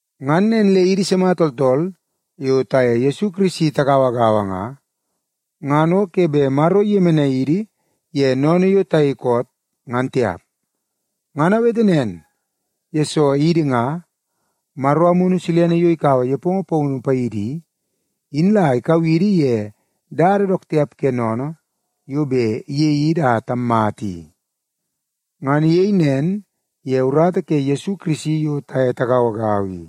Ngan nen le idi sima tooltool yo taye Yesu Kirisi tagauagaua nga, ngan o ke bet Maro iyemenai idi ye sennene yo tayei koot, ngan tiap. Ngan awete nen, yesoo idi nga, Maro Amunu Silene yo ikaua nepongo paunu paidi i, in la ikau idi ye dada dook tiap ke sennene yo bet iyei idi a tammata i. Ngan iyei nen ye urata ke Yesu Kirisi yo taye tagauagaua i.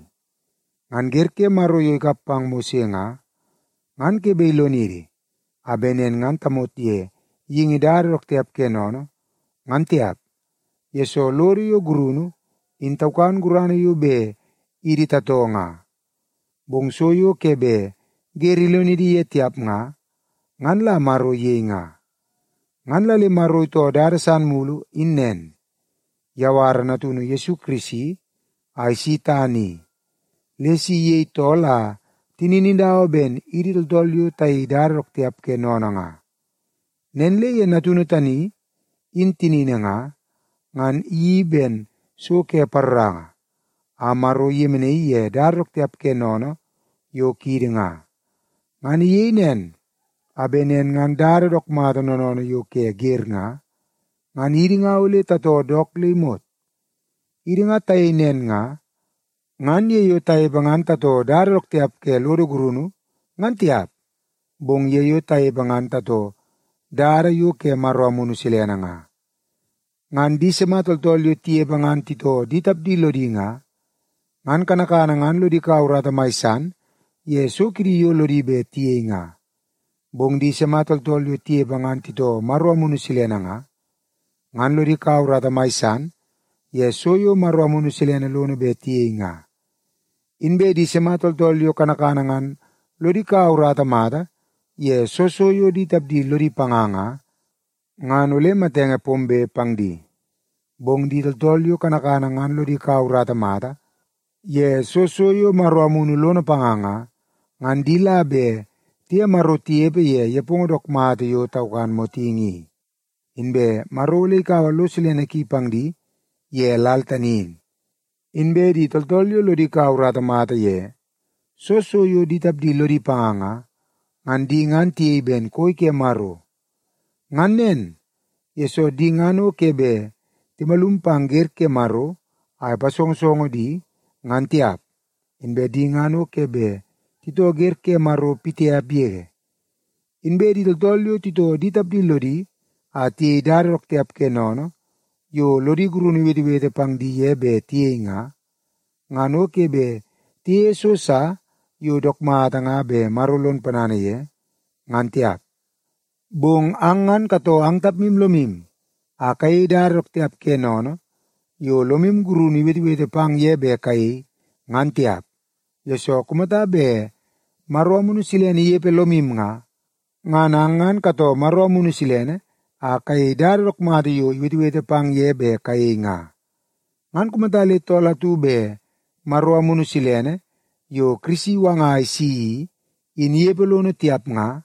Ngan wer ke Maro yo ikap pang Mose nga, ngan ke bet ilonidi a bet nen ngan tamot ye geingi dada dook tiap ke sennene, ngan tiap, yesoo lodo yo gurunu in taukan gurana yo bet idi tatoo nga. Bong so yo ke bet wer ilonidi ye tiap nga, ngan la Maro iyei nga. Ngan la le Maro itoo dada san mulu in nen; iyawara Natunu Yesu Kirisi a isi tana i, le si iyei tool a tinini dawa ben idi tooltool yo tayei dada dook tiap ke sennene nga. Nen le ye Natunu tani in tinini nga, ngan iyeii ben so ke paroranga, a Maro iyemenaii ye dada dook tiap ke sennene yo kiidi nga. Ngan iyei nen, a bet nen ngan dada dook mata noonoonoo yo ke wer nga, ngan idi nga ole tatoo dook le imot. Idi nga tayei nen nga, ngan ye yo tanepe ngan tatoo dada dook tiap ke lodo gurunu ngan tiap, bong ye yo tanepe ngan tatoo dada yo ke Maro Amunu Silene nga. Ngan di sima tooltool yo tinepe ngan titoo di tapdi lodi nga, ngan kanakana ngan lodi kaua urata mai san ye so kidi yo lodi bet tiyei nga. Bong di sima tooltool yo tinepe ngan titoo Maro Amunu Silene nga, ngan lodi kaua urata mai san ye so yo Maro Amunu Silene lono bet tiyei nga. Inbe di sima tooltool yo kanakana ngan lodi kaua urata mata ye soo so yo di tapdi lodi panga nga, ngan ole matenge pombe pang di. Bong di tooltool yo kanakana ngan lodi kaua urata mata ye soo so yo Maro Amunu lono panga nga, ngan di la bet tiye Maro tinepe ye nepongo dook mata yo taukan motingi i, inbe Maro ole ikaua lo silene ki pang di ye lal tani in. Inbe di tooltool yo lodi kaua urata mata ye soo so yo di tapdi lodi panga nga, ngan di ngan tiyei ben koi ke Maro. Ngan nen, yesoo di ngan o ke bet timalum pang wer ke Maro a ipasongosongo di, ngan tiap, inbe di ngan o ke bet titoo wer ke Maro pitiap yege. Inbe di tooltool yo titoo di tapdi lodi a tiyei dada dook tiap ke sennene yo lodi gurunu iwetewete pang di ye bet tiyei nga, ngan o ke bet tiyeie so sa yo dook mata nga bet Maro lon ponana ye, ngan tiap. Bong ang ngan katoo ang tapmu lomu a kayei dada dook tiap ke sennene yo lomu gurunu iwetewete pang ye bet kayei, ngan tiap, yesoo kumata bet Maro Amunu Silene inepe lomu nga, ngan ang ngan katoo Maro Amunu Silene a kayei dada dook mata yo iwetewete pang ye bet kayei nga. Ngan kumata le tool atu bet Maro Amunu Silene, yo Kirisi iwanga a isi i, in inepe lono tiap nga,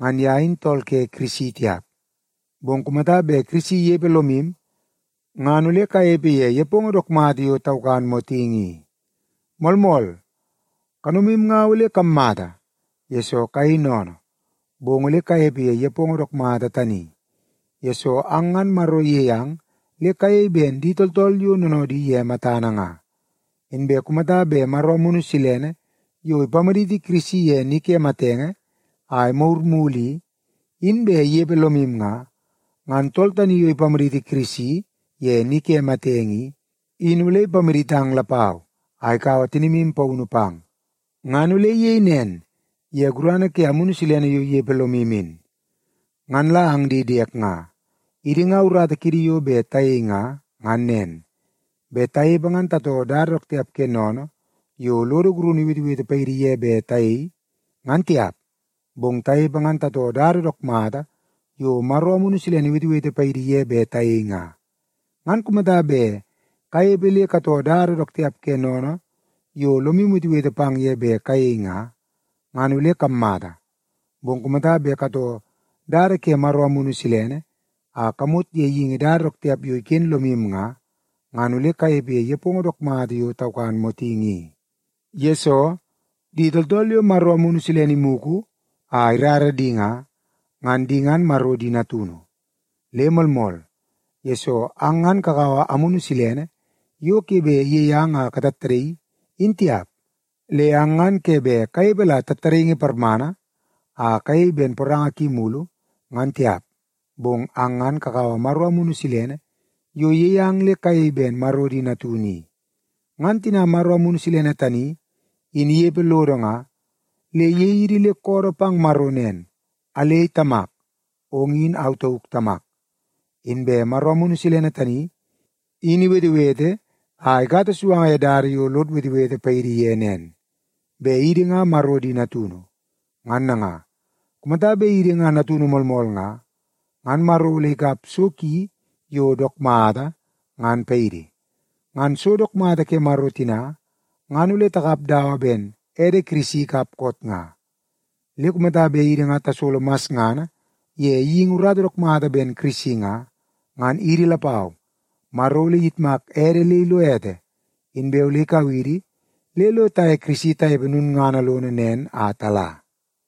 ngan ye in tool ke Kirisi tiap. Bong kumata bet Kirisi inepe lomu, ngan ole kanepe ye nepongo dook mata yo taukan motingi i. Moolmool, kanomu nga ole kammata, yesoo kayei sennene, bong ole kanepe ye nepongo dook mata tani, yesoo ang ngan Maro iyei ang le kayei ben di tooltool yo noonoodi ye matana nga. Inbe kumata bet Maro Amunu Silene yo ipamaditi Kirisi ye ni ke matenge a imagur mulu i, in bet inepe lomu nga, ngan tool tani yo ipamaditi Kirisi ye ni ke matenge i, in ole ipamaditang lapau a ikaua tinimu paunu pang. Ngan ole iyei nen ye gurana ke Amunu Silene yo inepe lomu in. Ngan la ang di diek nga, idi nga urata kiidi yo bet tayei nga, ngan nen; bet tanepe ngan tatoo dada dook tiap ke sennene yo lodo gurunu iwetewete paidi ye bet tayei, ngan tiap. Bong tanepe ngan tatoo dada dook mata yo Maro Amunu Silene iwetewete paidi ye bet tayei nga. Ngan kumata bet kanepe le katoo dada dook tiap ke sennene yo lomu iwetewete pang ye bet kayei nga, ngan ole kammata. Bong kumata bet katoo dada ke Maro Amunu Silene a kamot ye geingi dada dook tiap yo iken lomu nga, ngan ole kanepe ye nepongo dook mata yo taukan motingi i. Yesoo, di tooltool yo Maro Amunu Silene imugu a irara di nga, ngan di ngan Maro di natunu. Le moolmool, yesoo ang ngan kakaua Amunu Silene yo ke bet iyei ang a katattadaii, in tiap. Le ang ngan ke bet kanepe la tattadaingi parmana a kayei ben poranga ki mulu, ngan tiap. Bong ang ngan kakaua Maro Amunu Silene yo iyei ang le kayei ben Maro di natunu i. Ngan tina Maro Amunu Silene tani in inepe lodo nga, le iyei idi le koodoo pang Maro nen, “Alei Tamak, ong in au tauk Tamak.” Inbe Maro Amunu Silene tani in iwetewete a ikata suanga ye dada yo lod wetewete paidi ye nen, bet idi nga Maro di natunu. Ngan nanga, kumata bet idi nga natunu moolmool nga, ngan Maro ole ikap so ki yo dook mata, ngan paidi. Ngan so dook mata ke Maro tina, ngan ole takap dawa ben ede Kirisi ikap koot nga. Le kumata bet idi nga tasolo masngana ye geingi urata dook mata ben Kirisi nga, ngan idi lapau Maro ole iyitmak ede le ilo ete, inbe ole ikau idi le lo taye Kirisi tanepe lulngana lono nen a tala.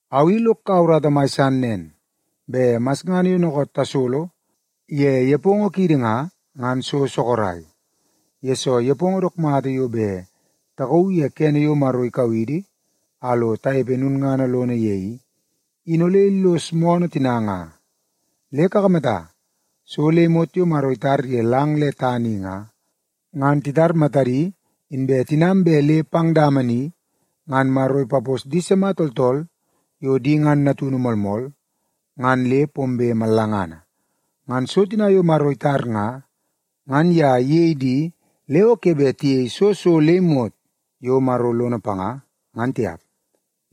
Au i lok kaua urata mai san nen, bet masngana yo dookoot tasolo ye nepongo kiidi nga, ngan so sorok, yesoo nepongo dook mata yo bet takauu ye kene yo Maro ikau idi a lo tanepe lulngana lono ye i, in ole illos moonoo tina nga. Le kakamata, so le imot yo Maro itar ye lang le tana i nga, ngan titar matadi inbe tinam bet le pang dama ni ngan Maro ipapos di sima tooltool yo di ngan natunu moolmool ngan le pombe mallangana. Ngan so tina yo Maro itar nga, ngan ye iyei di le o ke bet tiyei soo so le imot yo Maro lono panga, ngan tiap.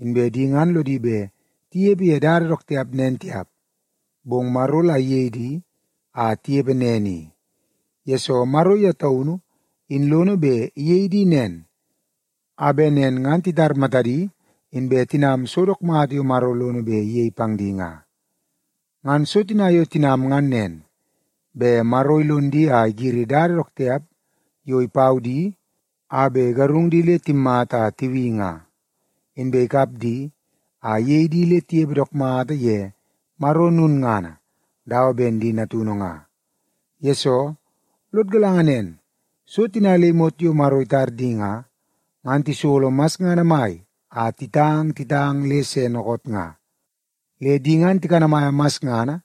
Inbe di ngan lodi bet tinepe ye dada dook tiap nen tiap, bong Maro la iyei di a tinepe nen i, yesoo Maro ye taunu in lono bet iyei di nen, a bet nen ngan titar matadi inbe tinam so dook mata yo Maro lono bet iyei pang di nga. Ngan so tina yo tinam ngan nen, bet Maro ilon di a igiri dada dook tiap yo ipau di a bet igarung di le timmata a tibi nga, inbe ikap di a iyei di le tinepe dook mata ye lulngana dawa ben di natunu nga. Yesoo, lod galanga nen, so tina le imot yo Maro itar di nga, ngan tisolo masngana mai a titang titang le se dookoot nga. Le di ngan tikanamaia masngana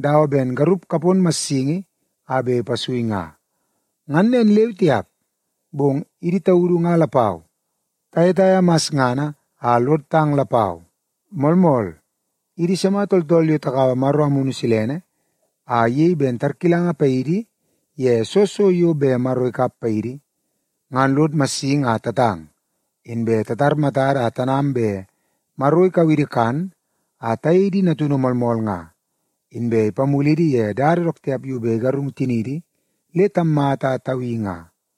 dawa ben garup kapon massingi a bet ipasui nga. Ngan nen leu tiap, bong idi taudu nga lapau, tayetaia masngana a lod tang lapau. Moolmool, idi sima tooltool yo takaua Maro Amunu Silene a iyei ben tarkilanga paidi ye soo so yo bet Maro ikap paidi, ngan lod massingi a tatang, inbe titar matada a tanam bet Maro ikau idi kan a tayei di natunu moolmool nga, inbe ipamulidi ye dada dook tiap yo bet igarung tiniidi le tammata a tabi nga.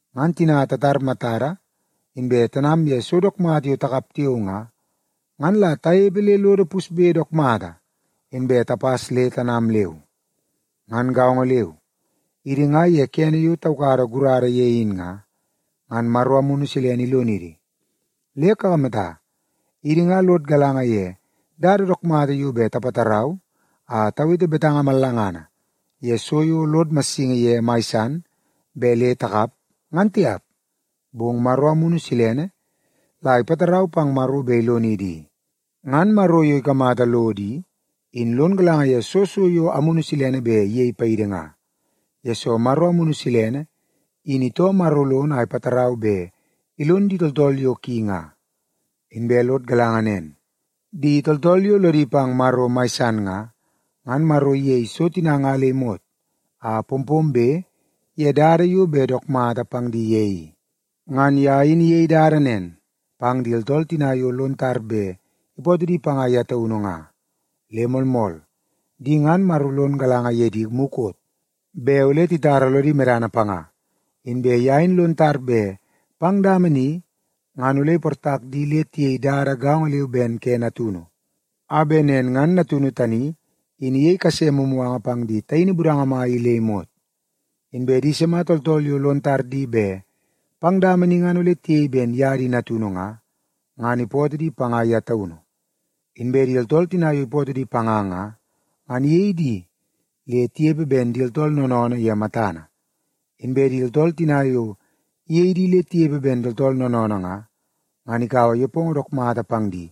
Ngan tina tatar matada inbe tanam ye so dook mata yo takap tiao nga, ngan la tanepe le lodo pusbe dook mata, inbe tapas le tanam leu. Ngan gaongo leu, idi nga ye kene yo taukada gurada ye in nga, ngan Maro Amunu Silene ilonidi. Le kakamata, idi nga lod galanga ye dada dook mata yo bet tapatarau a tawete betanga mallangana ye so yo lod massingi ye mai san bet le takap, ngan tiap, bong Maro Amunu Silene la ipatarau pang Maro bet ilonidi i. Ngan Maro yo ikamata lodo i, in lon galanga ye soo so yo Amunu Silene bet iyei paidi nga, yesoo Maro Amunu Silene in itoo Maro lono a ipatarau bet ilon di tooltool yo ki nga. Inbe lod galanga nen, di tooltool yo lodi pang Maro mai san nga, ngan Maro iyei so tina nga le imot a pompombe ye dada yo bet dook mata pang di ye i. Ngan ye in iyei dada nen pang di tooltool tina yo lon tar bet ipootoo di panga ye taunu nga. Le moolmool, di ngan Maro lon galanga ye di mukot bet ole titara lodi medana panga, inbe ye in lon tar bet pang dama ni ngan ole iportak di le tiyei dada gaongo leu ben ke Natunu, a bet nen ngan Natunu tani in iyei kase mumuganga pang di taini budanga mai i le imot. Inbe di sima tooltool yo lon tar di bet pang dama ni ngan ole tiyei ben ye di natunu nga, ngan ipootoo di panga ye taunu. Inbe di tooltool tina yo ipootoo di panga nga, ngan iyei di le tinepe ben di tooltool noonoonoo ye matana. Inbe di tooltool tina yo iyei di le tinepe ben di tooltool noonoonoo nga, ngan ikaua nepongo dook mata pang di,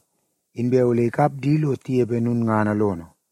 inbe ole ikap di lo tinepe lulngana lono.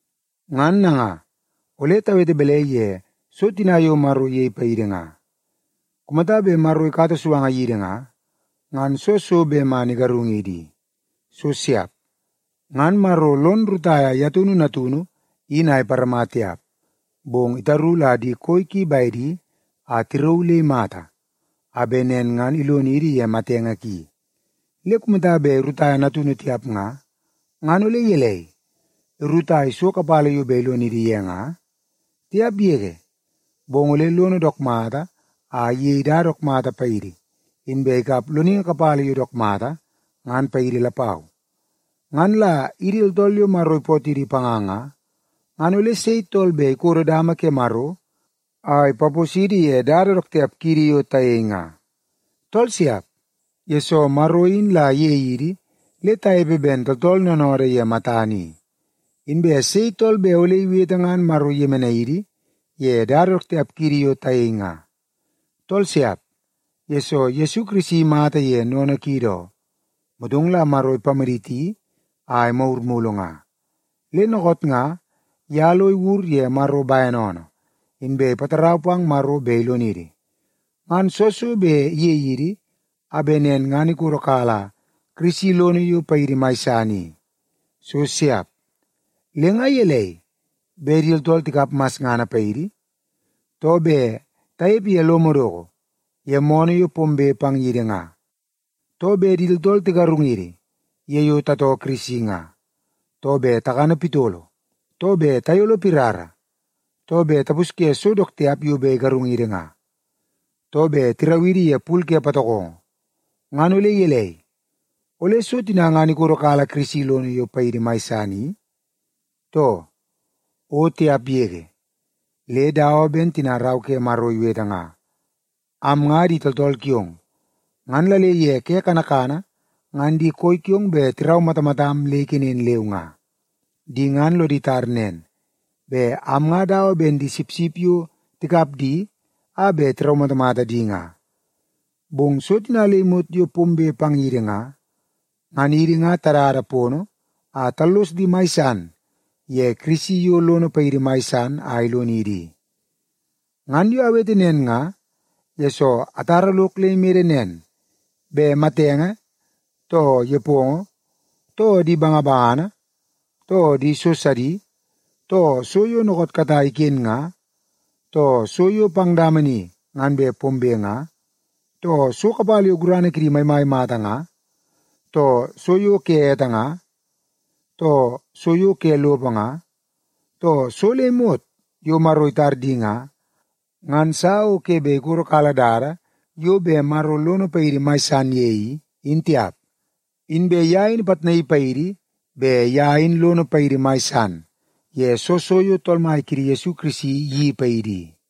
Ngan nanga, ole tawete balai ye so tina yo Maro iyei paidi nga? Kumata bet Maro ikata suanga yidi nga, ngan soo so bet man igarungidi i? So siap! Ngan Maro lon rutaia ye taunu Natunu in a iparama tiap, bong itaru la di koi ki bedi a tirauu le imata, a bet nen ngan ilonidi ye matenge ki. Le kumata bet irutaia Natunu tiap nga, ngan ole gelei, irutai so kapala yo bet ilonidi ye nga? Tiap yege! Bong ole lono dook mata a iyei dada dook mata paidi, inbe ikap loningi kapala yo dook mata, ngan paidi lapau. Ngan la idi tooltool yo Maro ipootidi panga nga, ngan ole sei tool bet ikodo dama ke Maro a ipaposidi ye dada dook tiap kiidi yo tayei nga? Tool siap, yesoo Maro in la iyei idi le tanepe ben tooltool noonoodoo ye matana i. Inbe sei tool bet ole iwete ngan Maro iyemenai idi ye dada dook tiap kiidi yo tayei nga? Tool siap, yesoo Yesu Kirisi imata ye sennene kiidi oo, motong la Maro ipamaditi a imagur mulu nga. Le dookoot nga, ye lo iwur ye Maro bene oonoo, inbe ipatarau pang Maro bet ilonidi. Ngan soo so bet iyei idi a bet nen ngan ikodokala Kirisi lono yo paidi mai san i? So siap! Le nga gelei, bet di tooltool tikap masngana paidi, too bet tanepe ye lo madoko ye moonoo yo pombe pang yidi nga, too bet di tooltool tigarungidi ye yo tatoo Kirisi nga, too bet takana pitolo, too bet tayolo pirara, too bet tapusye so dook tiap yo bet igarungidi nga, too bet tirau idi ye pul ke patokongo, ngan ole gelei, ole so tina ngan ikodokala Kirisi lono yo paidi mai san i, too? O tiap yege! Le dawa ben tina Rau ke Maro iwete nga, “Am nga di tooltool kiong, ngan la le ye ke kanakana ngan di koi kiong bet tiraumatamatam le ikenen leu nga. Di ngan lodi tar nen, bet am nga dawa ben di sipsip yo tikap di a bet tiraumatamata di nga.” Bong so tina le imot yo pombe pang yidi nga, ngan idi nga tadada podi a tallos di mai san ye Kirisi yo lono paidi mai san a ilonidi i. Ngan yo awete nen nga, yesoo atara lok le imede nen, bet matenge, too nepongo, too di bangabangana, too di so sidi, too so yo dookoot katai iken nga, too so yo pang dama ni ngan bet pombe nga, too so kapala yo gurana kidi maimai mata nga, too so yo ke ete nga, too so yo ke lopo nga, too so le imot yo Maro itar di nga, ngan sa o ke bet ikodokala dada yo bet Maro lono paidi mai san ye i, in tiap. Inbe ye in ipitnaii paidi bet ye in lono paidi mai san ye soo so yo Tool Mai kiidi Yesu Kirisi iyeii paidi i.